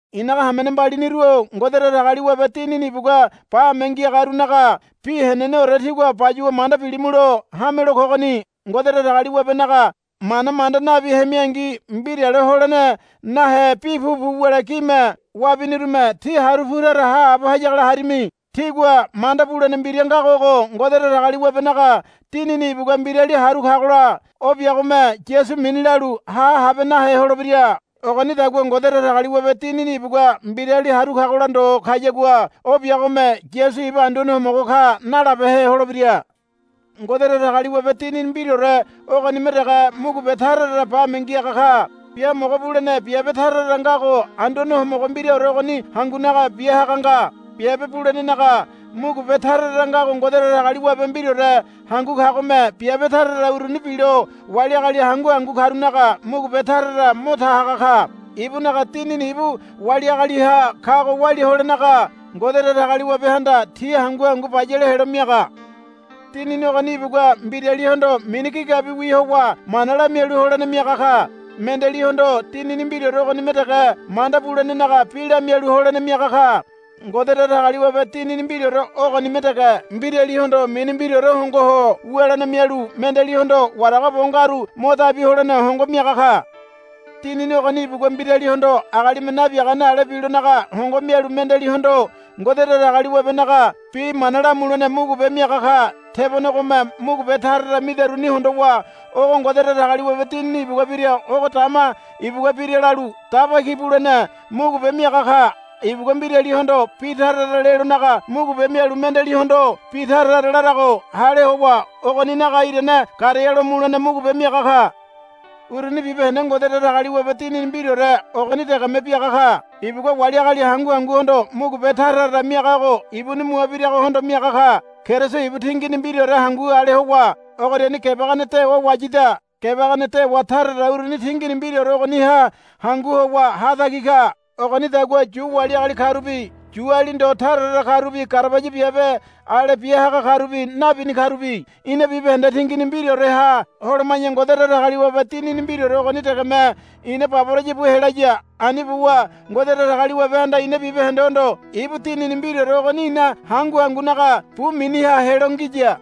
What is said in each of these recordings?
I̱naga hamene mbaliniru-o Ngode Datagaliwabe Dinini ibugua bame ngiagarunaga bi heneneore tígua bayuwa manda bilimulo hamelo kogoni. Ngode Datagaliwabenaga mana manda nabi hemingi mbirale holene nahe bi pupu wule gime wabinirume tí haru pu tara haabo hayagola harimi. Tígua manda bulene mbira ngago ogo, Ngode Datagaliwabenaga Dinini ibugua mbirali haru kagola o biagome Yasu mini lalu ha habe nahe holebira. Ogonidagua Ngode Datagaliwabe Dinini ibugua mbirali haru kagola ndo kayagua o biagome, Yasu ibu Anduane Homogo ka, nalabehe holebira. Ngode Datagaliwabe Dinini mbiraore ogonime dege mugube tara tara bame ngiaga ka. Biamogo bulene biabe tara tara ngago Anduane Homogo mbiraore ogoni hangunaga bia haga nga. Biabe bulenenaga mugube tara tara ngago Ngode Datagaliwabe mbiraore hangu kagome biabe tara tara uruni bilo wali agali hangu hangu karunaga mugube tara tara mo ta haga ka. Ibunaga Dinini ibu wali agaliha kago walia holenaga Ngode Datagaliwabehanda ti hangu hangu bayale helo miaga. Dinini ogoni ibugua mbiralihondo mini gigabiwi howa mana lamialu holene miaga ka. Mendealihondo Dinini mbiraore ogonime dege manda bulenenaga bi lamialu holene miaga ka. Ngode Datagaliwabe Dinini mbiraore ogonime dege mbiralihondo mini mbiraore hongo ho wulene mialu mendealihondo warago bo ngaru mo dabi holene hongo miaga ka. Dinini ogoni ibugua mbiralihondo agalime nabiagane ale bilonaga hongo mialu mendealihondo Ngode Datagaliwabenaga bi mana lamulene mugube miaga ka. Tebonegome mugube tara tara midaruni hondowa ogo Ngode Datagaliwabe Dinini ibugua bira ogo dama ibugua bira lalu daba ki bulene mugube miaga ka. Ibugua mbiralihondo bi tara tara lelonaga mugube mialu mendealihondo bi tara tara larago hale howa ogoninaga irane garealo mulene mugube miaga ka. Uruni bibahende Ngode Datagaliwabe Dinini mbiraore ogoni degeme biaga ka. Ibugua wali agali hangu hanguhondo mugube tara tara miagago ibuni mua biragohondo miaga ka. Keriso ibu tingini mbiraore hangu ale howa ogoriani gebagene dewa wayida. Gebagene dewa tara tara uruni tingini mbiraore ogoniha hangu howa hatagi ka. Ogonidagua Yu wali agali karubi Yuali ndo tara tara karubi garabaya biabe ale bia haga karubi nabini karubi ina bibahende tingini mbiraoreha holoma̱ya Ngode Datagaliwabe Dinini mbiraore ogoni degeme ina baboraya bu helaya. Ani buwa Ngode Datagaliwabehanda ina bibahendehondo ibu Dinini mbiraore ogoni ina hangu hangunaga bu miniha helo ngiya.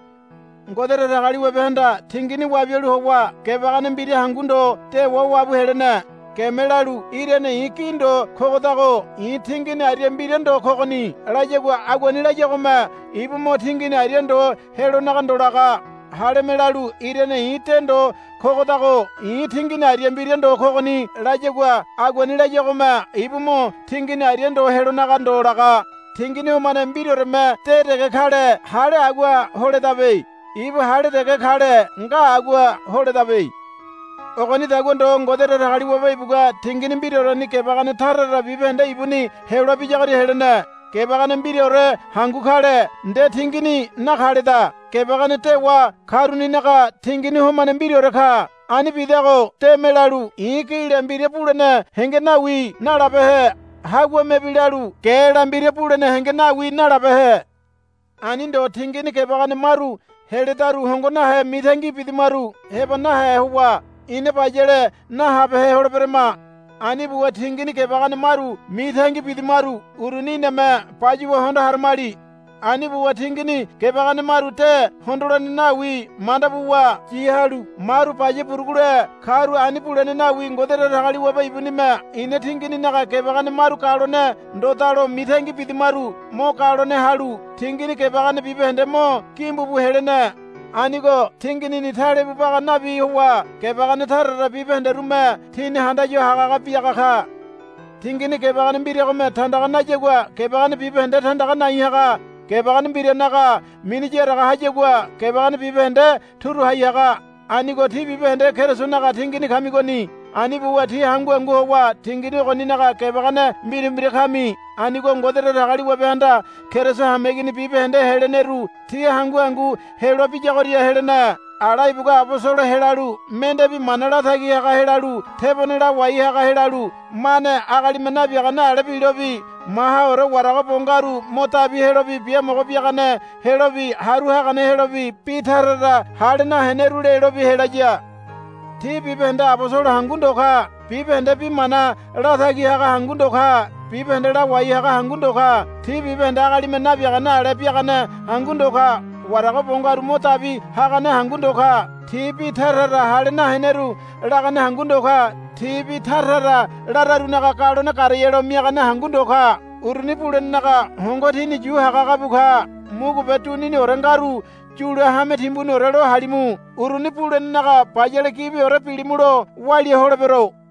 Ngode Datagaliwabehanda tingini wabialu howa gebagene mbira hangu ndo dewa wabu helene. Geme lalu, Irane i̱ gi ndo kogodago i̱ tingini aria mbira ndo kogoni, layagua aguani layagome ibu mo tingini aria ndo helonaga ndo laga. Haleme lalu, Irane i̱ de ndo kogodago i̱ tingini aria mbira ndo kogoni, layagua aguani layagome ibu mo tingini aria ndo helonaga ndo laga. Tingini homane mbiraoreme de dege kale hale agua holedabe. Ibu hale dege kale nga agua holedabe. Ogonidagua ndo Ngode Datagaliwabe ibugua tingini mbiraoreni gebagene tara tara bibahende ibuni heloa biyagoria helene. Gebagene mbiraore hangu kale nde tingini nakaleda. Gebagene dewa karuninaga tingini homane mbiraore ka. Ani bidago deme lalu, I̱ gila mbira bulene henge nawi, nalabehe. Haguamebi lalu, Gela mbira bulene henge nawi, nalabehe. Ani ndo tingini gebagene maru heledaru hongo nahe mitangi bidamaru heba nahe howa ina bayale nahabehe holeberama. Ani buwa tingini gebagene maru mitangi bidamaru uruni iname bayuwa hondo haramali. Ani buwa tingini gebagene maru de hondolene nawi manda buwa yi halu maru baya burugule karu ani bulene nawi. Ngode Datagaliwabe ibunime ina tingininaga gebagene maru galone ndodalo mitangi bidamaru mo galone halu tingini gebagene bibahende mo gimbu bu helene. Anigo tinginini talebu baga nabi howa gebagene tara tara bibahenderume tini handaya hagahaga biaga ka. Tingini gebagene mbiragome tandaga nayagua gebagene bibahende tandaga nai haga. Gebagene mbiranaga mini yaraga hayagua gebagene bibahende turu hai haga. Anigo tí bibahende Kerisonaga tingini kamigoni. Ani buwa tí hangu hangu howa tingini ogoninaga gebagene mbira mbira kami. Anigo Ngode Datagaliwabehanda Keriso hameigini bibahende heleneru ti hangu hangu heloa biyagoria helene. Ala ibugua abosolo helalu mende bi mana latagi haga helalu tebone lawai haga helalu mane agalime nabiagane ale bilobi mahaore warago bo ngaru mo dabi helobi biamogo biagane helobi haru hagane helobi bi tara tara hale naheneru lelobi helaya. Ti bibahende abosolo hangu ndo ka. Bibahende bi mana latagi haga hangu ndo ka. Bibahende lawai haga hangu ndo ka. Ti bibahende agalime nabiagane ale biagane hangu ndo ka. Warago bo ngaru mo dabi hagane hangu ndo ka. Ti bi tara tara hale naheneru lagane hangu ndo ka. Ti bi tara tara lararunaga galone garealo miagane hangu ndo ka. Uruni bulenenaga hongo tini yu haga haga bu ka. Mugube duniniore ngaru yule hame timbuniore lo halimu. Uruni bulenenaga bayale gibiore bilimulo walia holebero.